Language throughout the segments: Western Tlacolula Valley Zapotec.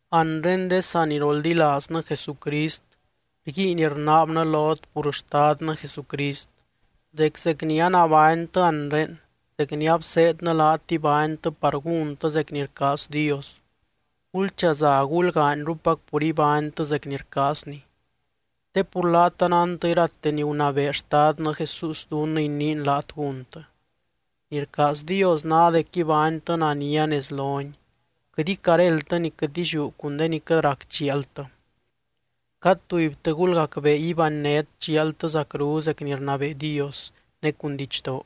Anre de saniroldilaaznɨ Jesucrist, rguiin rnaabnɨ lot pur Xtadnɨ Jesucrist, dec zec ni anabánytɨ anre, zec ni abseednɨ laat ibánytɨ par gúntɨ zec ni rcaaz Dios, gulchaza gulgaanyrupac pur ibánytɨ zec ni rcaazny. Te pur laat anántɨ irate ni gunabee Xtadnɨ Jesús dunnɨ iniin laat gúntɨ. Ni rcaaz Dios ná dec ibánytɨ nania nez lony, quɨt icaréldtɨ ni quɨt illiú cun de ni quɨt rac chialtɨ. Cad tubytɨ gulgacbee ibánnet chialtɨ zacru zec ni rnabee Dios ne cun didxdoo,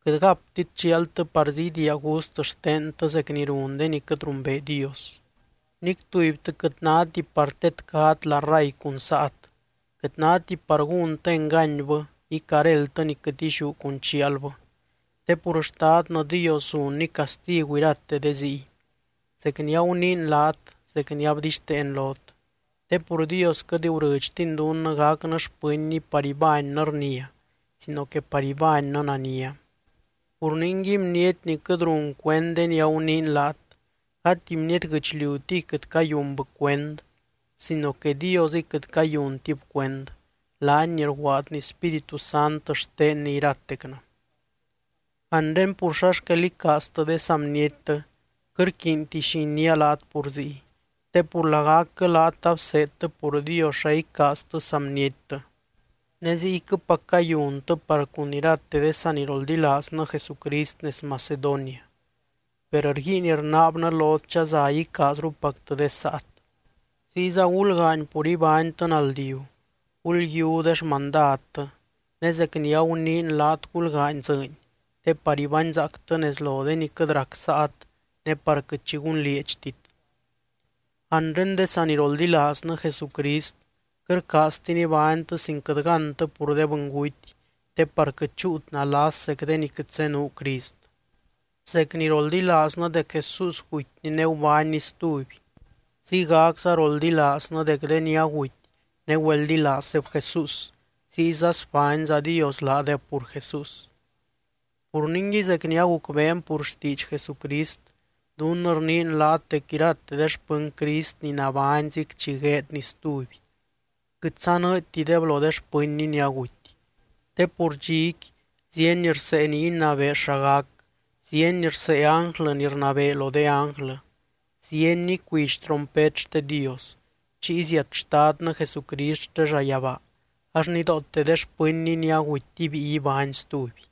quɨt gaptit chialtɨ parzí idiia gust xtentɨ zec ni run de ni quɨt rumbee Dios. Nic tubytɨ quɨt náti par tedcat la ray cun saat, quɨt náti par gúntɨ enganybɨ icaréldtɨ ni quɨt illiú cun chialbɨ. Te pur Xtadnɨ Dios zunny castigu irate de ziy, zec ni aguniin laat, zec ni abdixteen lot. Te pur Dios quɨt gurɨdxtiny dunnɨ gacnɨ xpɨnny par ibánnɨ rnia, sino que par ibánnɨ nania. Pur ningui bniety ni quɨt run cuend de ni aguniin laat, gati bniety guɨchliutiy quɨt cayunbɨ cuend sino que Diosɨy quɨt cayuntib cuend, laany ni rguaadny Spíritu Sant xtenny iratectɨ. Anre pur xa xquel icaaztɨ de saa bniettɨ, quɨt rquiinti xi iniia laat pur ziy. Te pur lagacquɨ laat abseedtɨ pur Dios xa icaaztɨ saa bniettɨ, ne ziyquɨpac cayuntɨ par cun irate de saniroldilaaznɨ Jesucrist nez Macedonia. Per rguiin rnaabnɨ lot chaza icaazrupactɨ de saat. Ziyza gulgaany pur ibánytɨ naldiu, gulyiú de xmandadtɨ, ne zec ni aguniin laat gulgaany dzɨɨny te par ibányzaactɨ nez lo de ni quɨt rac saat ne par quɨt xi gunlieedxtit. Anre de saniroldilaaznɨ Jesucrist, quɨt rcaaztin ibánytɨ sin quɨt gántɨ pur de bɨnguty te par quɨt chúut nalas zec de ni quɨt zenuu Crist. Zec ni roldilaaznɨ dec Jesús gutyny ne gubánny stuby, ziygacza roldilaaznɨ dec de ni aguty ne güeldilaazdeb Jesús, ziyza sbányza Dios laadeb pur Jesús. Pur ningui zec ni agucbeen pur xtiidx Jesucrist, dunnɨ rniin laat dec irate de xpɨny Crist ni nabányzic chi gueedny stuby, quɨt sanɨɨdytideb lo de xpɨnny ni aguty. Te pur dxiqui zíeny rsee ni inabee xa gac, zíeny rsee ánglɨ ni rnabee lo de ánglɨ, zíeny icuidx trompet xte Dios. Chiy ziat Xtadnɨ Jesucrist xte llayabaa, ax nidoote de xpɨnny ni aguty ibíi ibány stuby.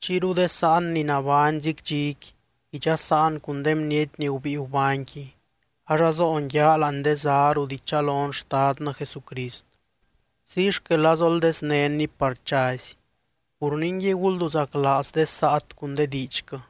Chiyru de sáan ni nabányzic dxiqui idxasaan cun de bniety ni gubíi gubányqui, ax azoon yaa láani de zá rut ichalon Xtadnɨ Jesucrist. Ziy xquel azoldeznénny par chazy. Pur ningui gulduzaclaaz de saat cun de diidxquɨ.